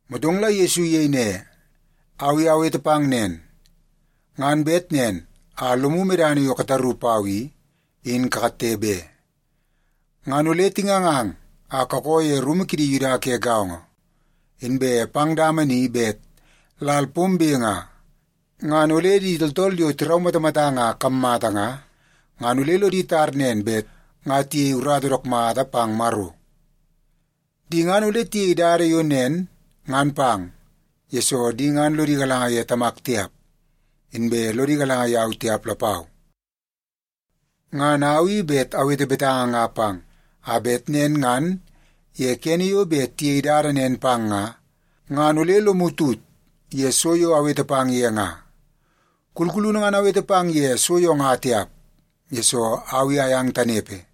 Motong la Yesu iyei ne, “Au i awete pang nen nga, ngan bet nen a lomu medana yo kataru pau i, in katte be. Ngan ole tingangang a kakoo ye rumu kidi Yuda ke gaongo. Inbe pang dama ni bet lal pombe nga, ngan ole di tooltool yo tiraumatamatang a kammata nga, ngan ole lodi tar nen bet nga tiyei urata dook mata pang Maro. Di ngan ole tiyei dada yo nen ngan pang, yesoo di ngan lodi galanga ye Tamak tiap, inbe lodi galanga yau tiap lapau. Ngan au i bet awete betanga nga pang, a bet nen ngan ye kene yo bet tiyei dada nen pang nga, ngan ole lomu tut ye so yo awete pang ye nga. Kulkulunu ngan awete pang ye so yo nga tiap, yesoo au i ayang tanepe.”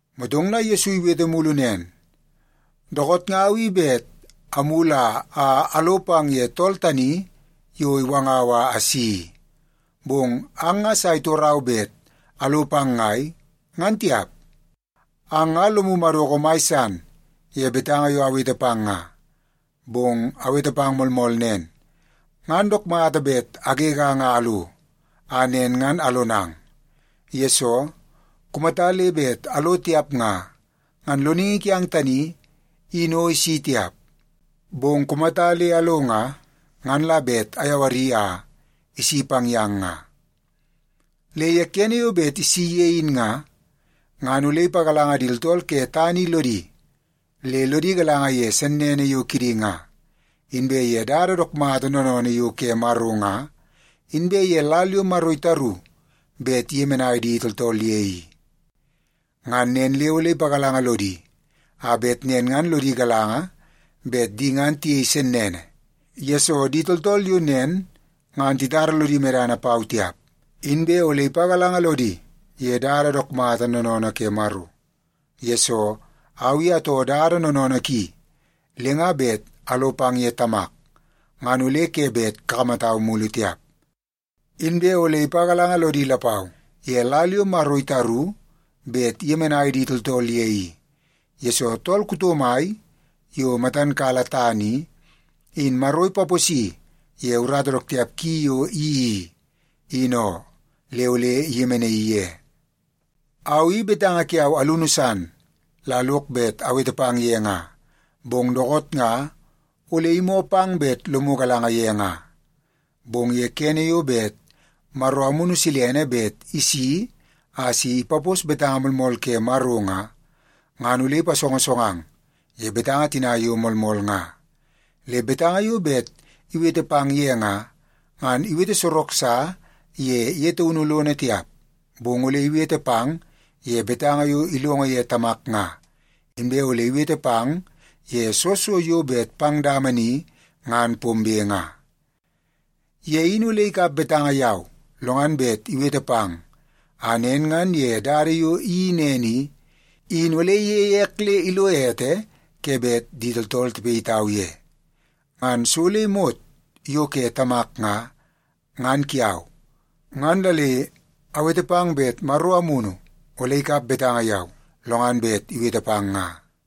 Motong la Yesu iwete mulu nen, “Dookoot nga au i bet amulu a alo pang ye tool tani yo iwangau a asi i, bong ang nga sa itorau bet alo pang ngai, ngan tiap. Ang nga lomu madoko mai san ye betanga yo awete pang nga. Bong awete pang moolmool nen, ngan dook mata bet agegang a alo, a nen ngan alonang. Yesoo, kumata le bet alo tiap nga, ngan Loningi kiang tani in o isi tiap. Bong kumata le alo nga, ngan la bet ayawari a isi pang yang nga. Le ye kene yo bet isi ye in nga, ngan ole ipagalanga di tooltool ke tana i lodi, le lodi galanga ye sennene yo kidi nga, inbe ye dada dook mata noonoonoo yo ke Maro nga, inbe ye lal yo Maro itaru bet iyemenai di tooltool ye i. Ngan nen le ole ipagalanga lodi a bet nen ngan lodi galanga bet di ngan tiyei sennene, yesoo di tooltool yo nen ngan titara lodi medana pau tiap. Inbe ole ipagalanga lodi ye dada dook mata noonoonoo ke Maro, yesoo au i atoo dada noonoonoo ki le nga bet alo pang ye Tamak, ngan ole ke bet kakamatau mulu tiap. Inbe ole ipagalanga lodi lapau ye lal yo Maro itaru bet iyemenai di tooltool ye i, yesoo tool kuto mai yo matan kala tana i, in Maro ipaposi ye urata dook tiap ki yo iyeii i, in oo, le ole iyemenaii ye. “Au i betanga kiau alunu san la lok bet awete pang ye nga, bong dookoot nga ole imoo pang bet lomu galanga ye nga. Bong ye kene yo bet Maro Amunu bet isi a si ipapos betanga moolmool ke Maro nga, ngan ole ipasongosongang ye betanga tina yo moolmool nga. Le betanga yo bet iwete pang ye nga, ngan iwete sorok sa ye ye taunu lono tiap, bong ole iwete pang ye betanga yo ilongo ye Tamak nga, inbe ole iwete pang ye soo so yo bet pang dama ni ngan pombe nga. Ye in ole ikap betanga yau, lo ngan bet iwete pang, a nen ngan ye dada yo iyeii nen i, in ole iyeie ek le ilo ete ke bet di tooltool tipayitau ye. Ngan so le imot yo ke Tamak nga, ngan kiau. Ngan la le awete pang bet Maro Amunu ole ikap betanga yau, lo ngan bet iwete pang nga.”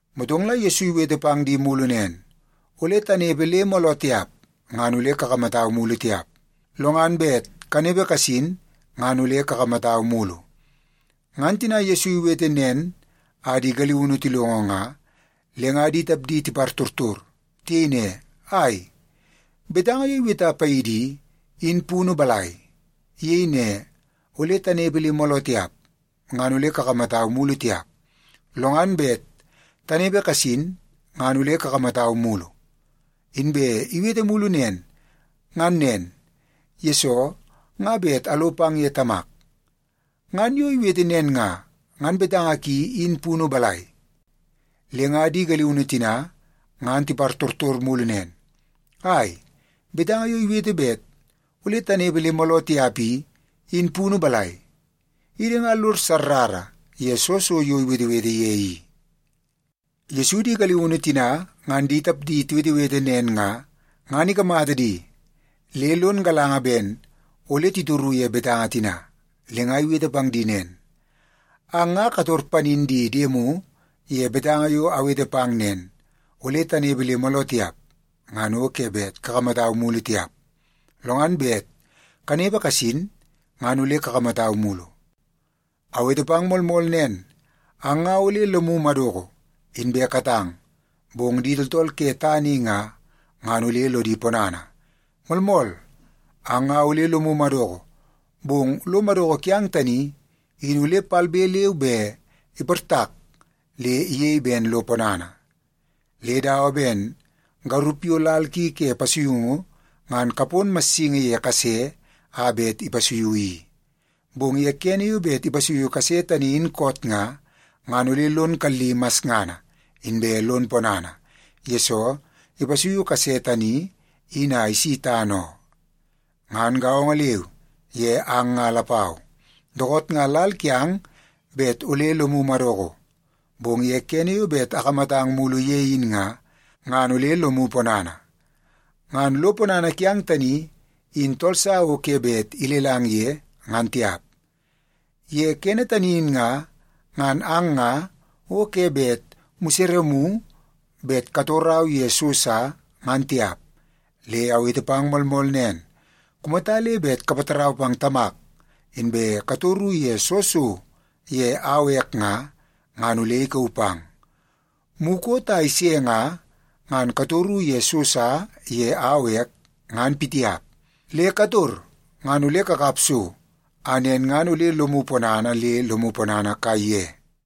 Motong la Yesu iwete pang di mulu nen, “Ole tanepe le mooloo tiap, ngan ole kakamatau mulu tiap. Lo ngan bet kanepe kasin, ngan ole kakamatau mulu.” Ngan tina Yesu iwete nen a di galiunu tilongo nga, le nga di tapdi tipartortor. Tiyei ne, “Ai, betanga yo iweta paidi i, in punu balai? Iyei ne, ‘Ole tanepe le mooloo tiap, ngan ole kakamatau mulu tiap. Lo ngan bet kanepe kasin, ngan ole kakamatau mulu.’ Inbe iwete mulu nen, ‘Ngan nen, yesoo nga bet alo pang ye Tamak.’ Ngan yo iwete nen nga, ngan betanga ki in punu balai?” Le nga di galiunu tina ngan tipartortor mulu nen, “Ai, betanga yo iwete bet ole tanepe le mooloo tiap i, in punu balai? Idi nga lod sarrara ye soo so yo iwetewete ye i.” Yesu di galiunu tina ngan di tapdi tiwetewete nen nga, ngan ikamata di le lon galanga ben ole titoru ye betanga tina. Le nga iwete pang di nen, “Ang ngan kator panin di diemu ye betanga yo awete pang nen, ‘Ole tanepe le mooloo tiap, ngan o ke bet kakamatau mulu tiap. Lo ngan bet kanepe kasin, ngan ole kakamatau mulu.’ Awete pang moolmool nen, ang nga ole lomu madoko, inbe katang, bong di tooltool ke tana i nga, ngan ole lodi ponana. Moolmool, ang nga ole lomu madoko, bong lo madoko kiang tani in ole palbe leu be iportak le iyei ben lo ponana. Le dawa ben garup yo lal ki ke pasuiungu ngan kapon massingi ye kase a bet ipasuiu i. Bong ye kene yo bet ipasuiu kase tani in koot nga, ngan ole lon kalli masngana, inbe lon ponana, yesoo ipasuiu kase tani in a isi tana oo. Ngan gaongo leu ye ang nga lapau. Dookoot nga lal kiang bet ole lomu madoko, bong ye kene yo bet akamatang mulu ye in nga, ngan ole lomu ponana. Ngan lo ponana kiang tani in tool sa o ke bet ilelang ye, ngan tiap. Ye kene tani in nga, ngan ang nga o ke bet museremu bet katorau ye so sa, ngan tiap. Le awete pang moolmool nen, kumata le bet kapatarau pang Tamak, inbe katoru ye soo so ye au ek nga, ngan ole ikauu pang. Mukot a ise nga, ngan katoru ye so sa ye au ek, ngan pitiap. Le kator ngan ole kakap so, a nen ngan ole lomu ponana le lomu ponana kaiye.”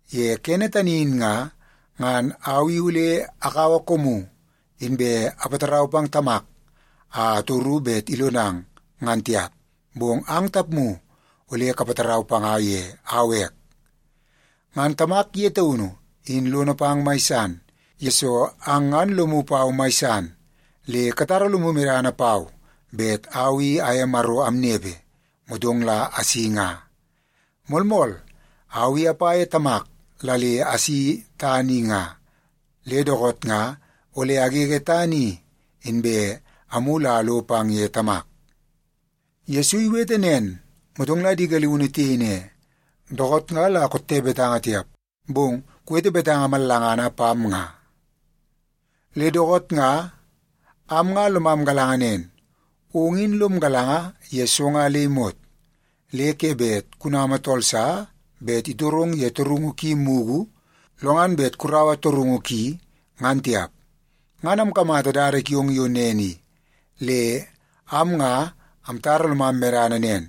Ye kene tani in nga, ngan au i ole akaua koomu, inbe apatarau pang Tamak a atoru bet ilonang, ngan tiap, bong ang tapmu ole kapatarau panga ye au ek. Ngan Tamak ye taunu in lono pang mai san, yesoo ang ngan lomu pau mai san le katara lomu medana pau bet au i aye Maro amnepe, motong la asi nga. Moolmool, au i apa ye Tamak la le asi tana i nga, le dookoot nga ole agege tana i, inbe amulu a alo pang ye Tamak.” Yesu iwete nen, motong la di galiunu tiyei ne, “Dookoot nga la kotte betanga tiap, bong kuwete betanga mallangana pam nga. Le dookoot nga am nga lomam galanga nen, ong in lom galanga ye so nga le imot. Le ke bet kunama tool sa bet itorong ye torungu ki mugu, lo ngan bet kuraua torungu ki, ngan tiap. Ngan amkamata dada kiong yo nen i, le am nga amtara lomam medana nen,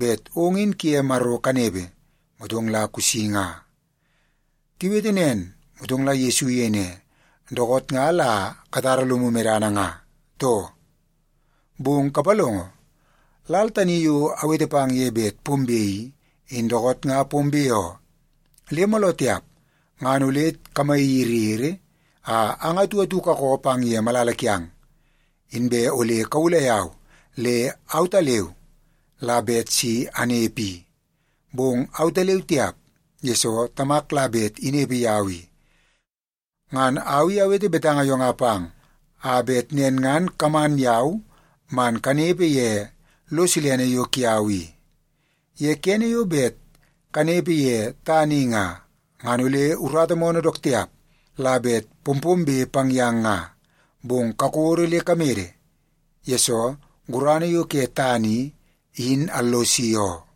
bet ong in kuye Maro kanepe, motong la kusi nga.” Tiwete nen, motong la Yesu iyei ne, “Dookoot nga la o katara lomu medana nga, too? Bong kapalongo, lal tani yo awete pang ye bet pombe i, in dookoot nga pombe oo. Le mooloo tiap ngan ole kamayiriyiri a ang atu atu kakoo pang ye malala kiang. Inbe ole kawulai yau le autaleu la bet si anepe i. Bong autaleu tiap, yesoo Tamak la bet inepe yau i. Ngan au i awete betanga yo nga pang, a bet nen ngan kaman yau man kanepe ye lo silene yo kiau i. Ye kene yo bet kanepe ye tana i nga, ngan ole urata moonoo dook tiap la bet pompombe pang yang nga. Bong kakodo le kamede, yesoo gurana yo ke tana i, in allosi oo.”